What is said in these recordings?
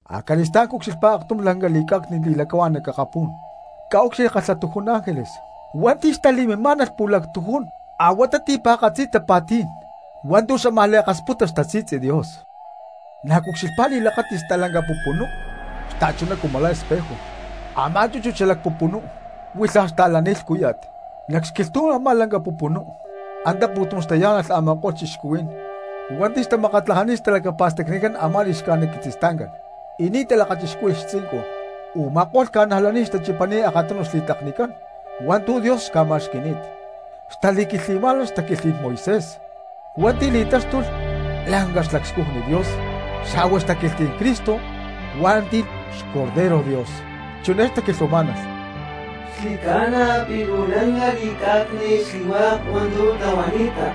Acali̠stá̠n cucxilhpá aktum lanca li̠cá̠cni̠t li̠lacahuá̠n nac akapú̠n: cca̠úcxilhli kalhatujún ángeles hua̠nti̠ xtali̠mimá̠nalh pu̠lactujún a̠huatá ti̠pa̠katzi tapa̠tí̠n hua̠ntu̠ xámaj li̠akasputa xtasi̠tzi Dios. Na̠ cucxilhpá li̠lakáti̠t stalanca pupunú xta̠chuná cumu la̠ espejo, a̠má chúchut xalac pupunú huilhaj xta̠lani̠t lhcúya̠t. Nac xquilhtú̠n a̠má lanca pupunú antá pu̠tum xtayá̠nalh a̠ma̠ko̠lh cristianos hua̠nti̠ xtamakatlajani̠t xtalacapa̠stacni a̠má li̠xcájnit quitzistancán y ni̠ talakachixcúhui̠lh xtzincun, u̠ma̠ko̠lh cristianos xtachipani̠t akatunu xli̠tlaknicán hua̠ntu̠ Dios xca̠ma̠xqui̠ni̠t. Xtali̠quilhtli̠má̠nalh xtaquilhtlí̠n Moisés hua̠nti̠ li̠táxtulh lanca xlacscujni Dios, xa̠hua xtaquilhtlí̠n Cristo hua̠nti̠ li̠taxtuy xBorrego. Chiné xtaquilhuamá̠nalh: Xli̠ca̠na pi̠ luu lanca li̠cá̠cni̠t xli̠hua̠k hua̠ntu̠ tlahuani̠ta,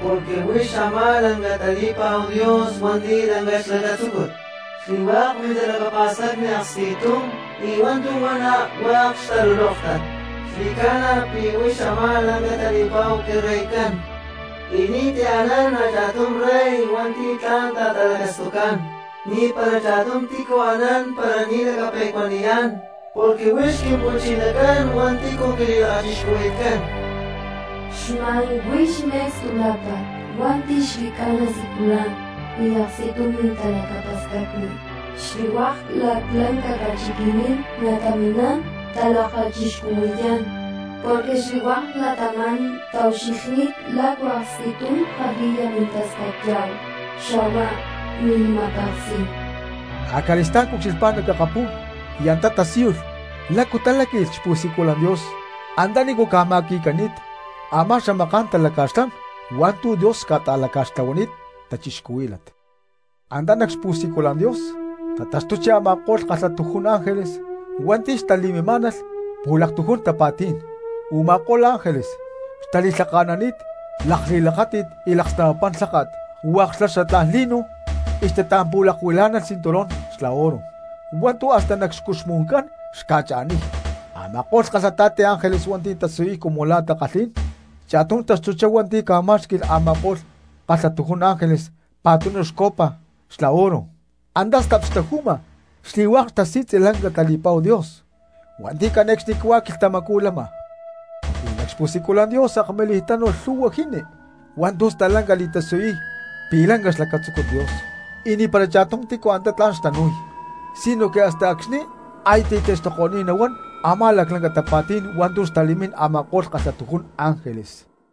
porque huix a̠má lanca tali̠pa̠hu Dios hua̠nti̠ lanca xlacatzúcut. Xli̠hua̠k mintalacapa̠stacni hua̠k aksti̠tum y hua̠ntu̠ huana hua̠k xtalulóktat, xli̠ca̠na pi̠ huix a̠má lanca tali̠pa̠hu quiReycán y ni̠ti̠ anán a̠cha̠tum rey hua̠nti̠ tla̠n ta̠talacastucá̠n. Ni̠para cha̠tum tícu anán para ni̠ lacape̠cuaniyá̠n porque huix Quimpu̠chinacán hua̠nti̠ quili̠lakachixcuhui̠tcán. Xma̠n huix me̠cstu lápa̠t hua̠nti̠ xli̠ca̠na siculan y aksti̠tum mintalacapa̠stacni. Xli̠hua̠k laclanca ca̠chiqui̠ní̠n nataminá̠n talakachixcuhui̠yá̠n, porque xli̠hua̠k cristianos taucxilhní̠t lacu aksti̠tum kalhi̠ya mintastacyá̠hu xa̠hua mili̠ma̠peksí̠n. Acali̠stá̠n cucxilhpá nac akapú̠n y antá tasíyulh lácu taláqui̠lh xpu̠siculan Dios antanícu ca̠ma̠qui̠cani̠t a̠má xamaká̠n talaca̠xlán hua̠ntu̠ Dios xca̠ta̠tlahuani̠t cristianos. Antá nac xpu̠siculan Dios tataxtuchi a̠ma̠ko̠lh kalhatujún ángeles hua̠nti̠ xtali̠mimá̠nalh pu̠lactujún tapa̠tí̠n. Uma̠kó̠lh ángeles xtali̠lhaka̠nani̠t lakli̠lakáti̠t y laksnapapán lháka̠t hua̠k xla xatlá̠n lino y xtatampu̠lakuilá̠nalh cinturón xla oro hua̠ntu̠ hasta nac xcuxmu̠ncán xca̠cha̠niy. Ama̠ko̠lh kalhata̠ti ángeles hua̠nti̠ tatasiyuy cumu la̠ takalhí̠n, cha̠tum taxtuchá hua̠nti̠ ca̠má̠xqui̠lh a̠ma̠ko̠lh kalhatujún ángeles pa̠tunu copa xla oro, antá stap xtaju̠ma xli̠hua̠k xtasi̠tzi lanca tali̠pa̠hu Dios hua̠nti̠ cane̠cxnicahuá quilhtamacú lama. Y nac xpu̠siculan Dios akmilij tánu̠lh lhu̠hua jini hua̠ntu̠ stalanca li̠tasiyuy pi̠ lanca xlacatzúcut Dios, y ni̠para cha̠tum tícu antá tla̠n xtanu̠y sinoque hasta acxni̠ aya ti̠taxtuko̠ni̠t nahuán a̠má laclanca tapa̠tí̠n hua̠ntu̠ xtali̠mín a̠ma̠ko̠lh kalhatujún ángeles.